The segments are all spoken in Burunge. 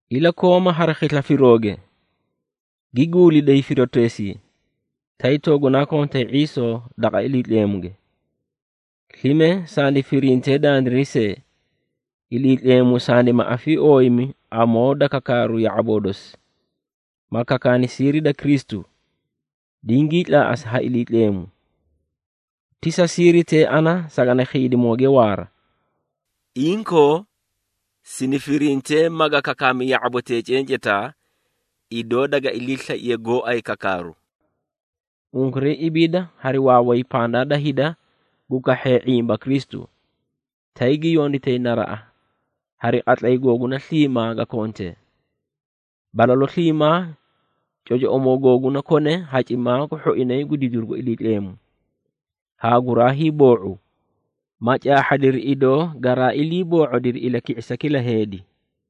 Ilakooma hari khisla firooge, gi guuliday firooteesii, tay toogunaa kontay ⁄iisoo daqa Iliitleemuge. Slime sandi firintee dandiray see, Iliitleemu sandima afiiooyimi amoo da kakaaru ya⁄aboo dosi, ma kakaani siiri da Kristu, dingii tlaaꞌasi ha Iliitleemu. Ti sa siiritee ana sagani khiidimooge waara. Inkoo, sini firintee maga kakaami ya⁄abotee cencetaa, idoo daga iliislaiye gooay kakaaru. Unkuray ibiida hari waaway pandaa da hida gu kahhee ⁄imba Kristu, tay gi yonditay naraꞌa hari qatlay googuna sliimaa ga kontee. Balalu sliimaa cocoꞌomoo googuna kone hacimaa gu hhoinay gu didiru gu Iliitleemu, haa guraa hiiboo⁄u, ma caahhadiri, idoo garaa iliiboo⁄odiri ilaki⁄isa kila heedi.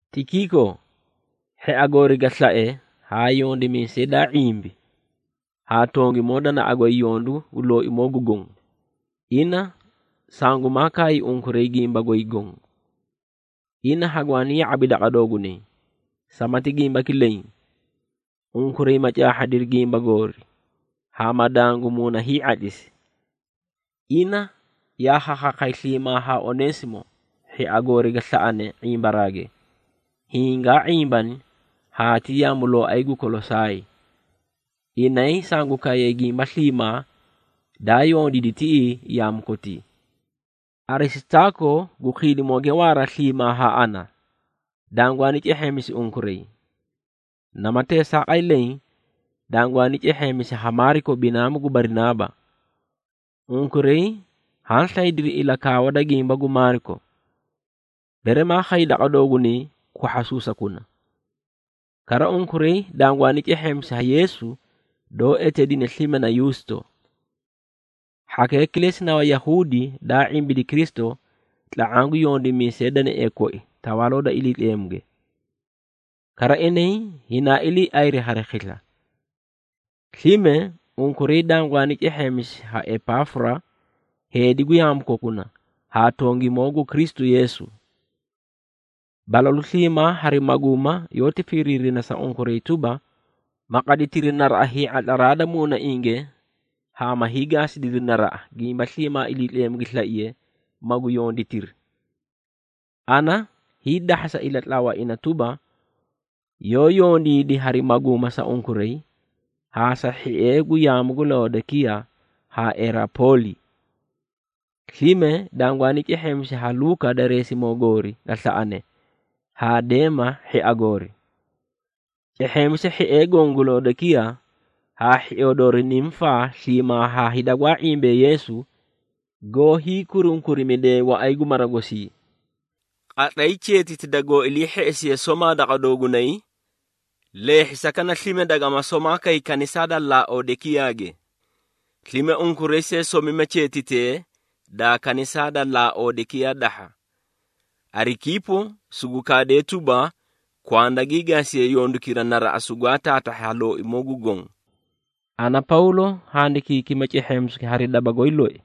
Tikiiko, hhia goori ga slae haa yondimiisay daa ⁄imbi, haa tongimoo danaꞌa goy yondu gu Looimoo gu Gonge, ina sangumaa kaay unkuray gimba goy goõ. Ina hagwaani ya⁄abi daqa doogunay, samati gimbaki leẽ unkuray ma caahhadiri gimba goori haa ma dangu muuna hii⁄atlisi. Ina yaa khakhaakhay sliimaa haa Oneesimo, hhia goori ga slaꞌane ⁄imbaraage, hiĩ gaa ⁄imbani haa ti yaamulooay gu Kolosaay. Inay sangu kaayay gimba sliimaa daa yondiidi tiꞌii yaamu kotii. Arisitaako gu khiidimooge waara sliimaa haa ana, dangwaani cehheemisi unkuray. Nama teesaaqay leẽ, dangwaani cehheemisi ha Maariko binaamu gu Barinaaba. Unkuray haã slaydiri ilakaawa da gimba gu Maariko, bere maa khay daqa doogunay kwahhasuusakuna. Kara, unkuray dangwaani cehheemisi ha Yeesu doó eteedina slime na Yuusto. Hhakee kilesi na Wayahuudi daa ⁄imbidi Kristu tla⁄aã gu yondimiisee danaee koi Tawaaloo da Iliitleemuge. Kara, inay hinaa iliiayri hari khisla. Slime, unkuray dangwaani cehheemisi ha Epaafura, heedi gu yaamu kokuna haa tongimoo gu Kristu Yeesu. Balalu sliimaa hari maguuma yoóti firiirina sa unkuray tuba, ma qaditiri naraꞌa hii⁄atla da muunainge haa ma hiigaasidiri naraꞌa, gimba sliimaa Iliitleemu gi slaiye magu yonditiri. Ana hiidahhasa ilatlawa ina tuba, yoó yondiidi hari maguuma sa unkuray haa sa hhiee gu yaamu gu Laodekiyaa haa Hierapooli. Slime, dangwaani cehheemisi ha Luuka dareesimoo goori ga slaꞌane haa Deema hhia goori. Cehheemisa hhiee goõ gu Laodekiyaa haa hhioo doori Nimufaa sliimaa haa hida gwaa ⁄imbee Yeesu goó hiikurunkurimidee waꞌay gu mara gosii. Qatlay cheetiti dangoó ilii hheꞌesiye somaa daqa doogunay, lehhisakana slime dagama somaa kay kanisaa da Laodekiyaage. Slime unkuray see somima cheetitee daa kanisaa da Laodekiyaa dahha. Arikiipo sugu kaadee tuba, kwanda gii gaasiye yondukira naraꞌa sugwaa taatahhi ha Looimoo gu Goõ. Ana, Pawlo handikiikima cehheemisuki hari daba goy loi.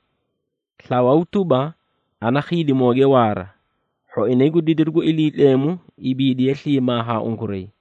Slawaw tuba, ana khiidimooge waara. Hhoinay gu didiru gu Iliitleemu ibiidiye sliimaa haa unkuray.